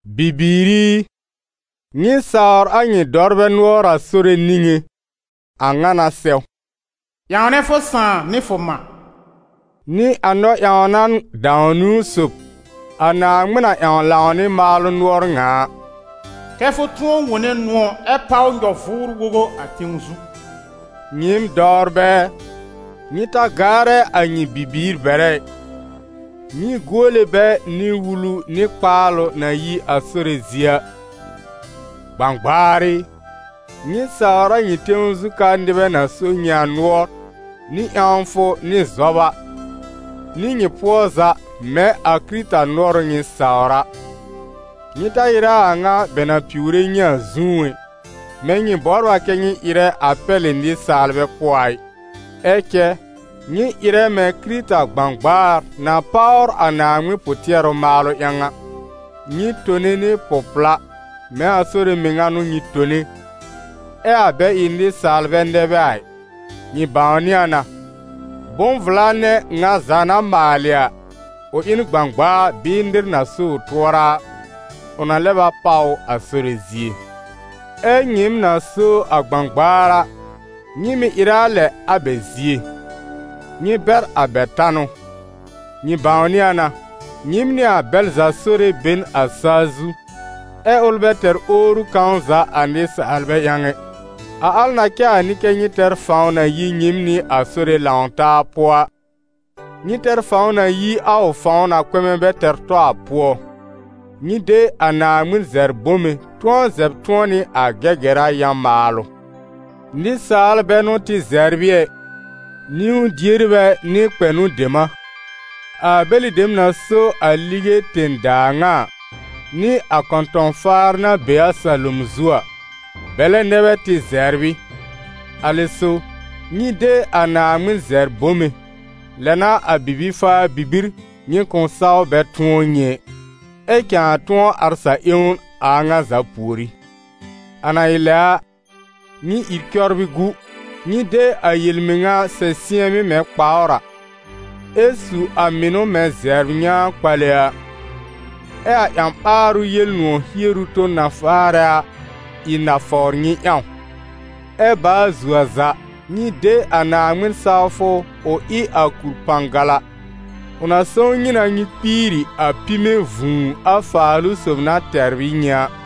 Bibiir i, nyɩ sawr a nyɩ dɔwrbɛ nʋɔr a Sore niŋé, a ŋa n'a sɛw. «Ƴãwnɛ fʋ sãà nɩ fʋ mã» n'ɩ a Naaŋmɩn nɔ-ƴãwna dãw-niwn sob, a Naaŋmɩn na ƴãw lãw nɩ maalʋ nʋɔr ŋa a: «Kɛ́ fʋ tʋ̃ɔ wõne nʋ̃ɔ̀ ɛ páw nyɔ-vʋʋr-wogo a tẽw zu.» Nyɩɩm dɔwrbɛ ɛ, nyɩ ta gaarɛ a nyɩ bibiir bɛrɛ ɩ, nyɩ guole bɛ nɩ wulu nɩ kpaalʋ na yi a Sore zie a. Gbãgbaar ɩ, nyɩ sawr a nyɩ tẽw zu ka nɩbɛ na so nyɩ a nʋɔr, nɩ ƴãwfʋ nɩ zɔba, nɩ nyɩ pʋɔ za mɛ̃ a Kɩrɩta nʋɔr ʋ nyɩ sawr a. Nyɩ ta ɩrɛ a a ŋa bɛ na piwre nyɩ a zũú ɛ, mɛ̃ nyɩ bɔbr a kɛ nyɩ ɩrɛ a pɛlɩ nɩsaalbɛ pʋɔ a ɩ; ɛ cɛ nyɩ ɩrɛ mɛ̃ Kɩrɩta gbãgbaar na páwr a Naaŋmɩn pʋ-tɩɛrʋ maalʋ ƴãw a. Nyɩ tone nɩ pʋ-pla, mɛ̃ a Sore mɩŋa n'ʋ nyɩ tone, ɛ a bɛ ɩ nɩsaalbɛ nɛ bɛ a ɩ. Nyɩ bãwnɩ a na, bʋ̃-vla nɛ ŋa za na maalɩ a, ʋ ɩ n gbãgbaa bɩɩ nɩr na so ʋ tʋɔra a, ʋ na lɛb a páw ʋ a Sore zie. Ɛ nyɩɩm na so a gbãgbaar a, nyɩ mɩ̀ ɩrɛ a lɛ a bɛ zie. Nyɩ bɛr a bɛ tanʋ. Nyɩ bãwnɩ a na, nyɩɩm nɩ a bɛl za Sore be n a sa-zu, ɛ ʋl bɛ tɛr owru kãw za a nɩsaalbɛ ƴãw ɛ. A al na cɛ a n'ɩ kɛ́ nyɩ tɛr fãw na yi nyɩɩm nɩ a Sore lãw taa pʋɔ a, nyɩ tɛr fãw na yi a ʋ fãw na kpɛmɛ bɛ tɛr tɔ a pʋɔ. Nyɩ de a Naaŋmɩn zɛbr bome, tʋ̃ɔ zɛb tʋ̃ɔ nɩ a Gɛgɛra yã-maalʋ. Nɩsaal bɛ n'ʋ tɩ zɛbr ɩ ɛ, niwn-dierbɛ nɩ kpɛnʋ dem a, a bɛlɩ dem na so a lige tẽ-daa ŋa a, nɩ a kɔ̃tɔ̃-faar na be a salom zu a, bɛlɛ nɛ bɛ tɩ zɛbr ɩ. A lɛ so, nyɩ de a Naaŋmɩn zɛbr bome, lɛ n'a a bibi-faa-bibir, nyɩ kʋ̃ saw bɛ tʋ̃ɔ nyɩ ɛ, ɛ cãa tʋ̃ɔ ar sa-ƴẽwn a a ŋa za pùorí. A na ɩ lɛ a, nyɩ ìr cɔbrɩ gu: nyɩ de a yel-mɩŋa sɛ sɩ̃ɛmɩ́ mɛ̃ kpawr a, ɛ su a mɩnʋ mɛ̃ zɛbr nyãa-kpale a. Ɛ a ƴã-ɓaarʋ Yel-nʋ̃ɔ̀ hieru ton na faarɛ a, ɩ nafawr nyɩ ƴãw. Ɛ baa zuo a za, nyɩ de a Naaŋmɩn-sawfʋ ʋ ɩ a kur-pãgala, ʋ na sõw nyɩ na nyɩ kpiiri a pime vũu a Faalʋ-sob na tɛbr ɩ nyɩ a.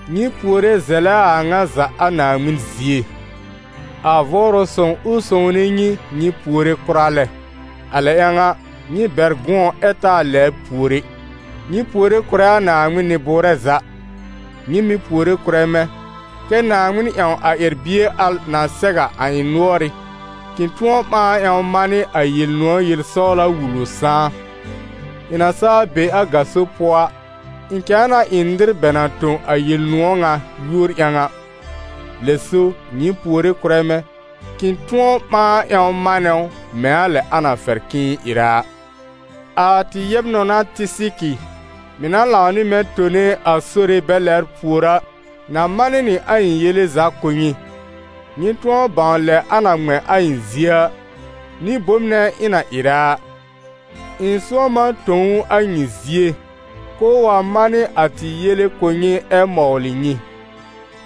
Nyɩ puore zɛlɛ a a ŋa za a Naaŋmɩn zie. A Vʋʋrʋ Sõw, ʋ sõwne nyɩ, nyɩ puore kʋra lɛ. A lɛ ƴãw a, nyɩ bɛr gʋ̃ɔ ɛ taa lɛbr pùor ɛ. Nyɩ puore kʋ̀rɛ a Naaŋmɩn nɩ-bʋʋrɛ za; nyɩ mɩ̀ puore kʋ̀rɛ mɛ̃, kɛ́ Naaŋmɩn ƴãw a ƴɛr-bie al na sɛw a a ɩ̃ nʋɔrɩ́, k'ɩ̃ tʋ̃ɔ ɓãa ƴãw manɩ a Yel-nʋ̃ɔ̀ yel-sɔwla wul ʋ sãá. Ɩ̃ na saa be a gaso pʋɔ a, ɩ̃ cãa na ɩ nɩr bɛ na tõ a Yel-nʋ̃ɔ̀ ŋa yúor ƴãw a. Lɛ so, nyɩ puore kʋ̀rɛ mɛ̃, k'ɩ̃ tʋ̃ɔ ɓãa ƴãw manɛ ʋ mɛ̃ a lɛ a na fɛr k'ɩ̃ɩ ɩrɛ a. A tɩ yɛb-nɔna Tɩsɩkɩ mɩ̀ na lãw nɩ mɛ̃ tone a Sore bɛ lɛbr pùor a, na manɩ nɩ a ɩ̃ yele za kʋ̀ nyɩ, nyɩ tʋ̃ɔ bãw lɛ a na ŋmɛ̃ a ɩ̃ zie a, nɩ bom nɛ ɩ̃ na ɩrɛ a. Ɩ̃ sʋ̃ɔm a tõ ʋ a nyɩ zie, k'ʋʋ wa manɩ a tɩ yele kʋ̀ nyɩ ɛ mɔwlɩ nyɩ.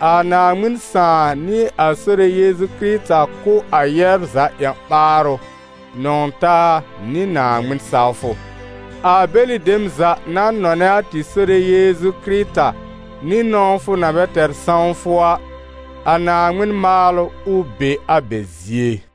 A Naaŋmɩn Sãà nɩ a Sore Yeezu Kɩrɩta kʋ̀ a yɛbr za ƴã-ɓaarʋ, nɔ̃w-taa nɩ Naaŋmɩn-sawfʋ. A bɛlɩ dem za na nɔnɛ a tɩ Sore Yeezu Kɩrɩta nɩ nɔ̃wfʋ na bɛ tɛr sãwfʋ a, a Naaŋmɩn maalʋ, ʋ be a bɛ zie.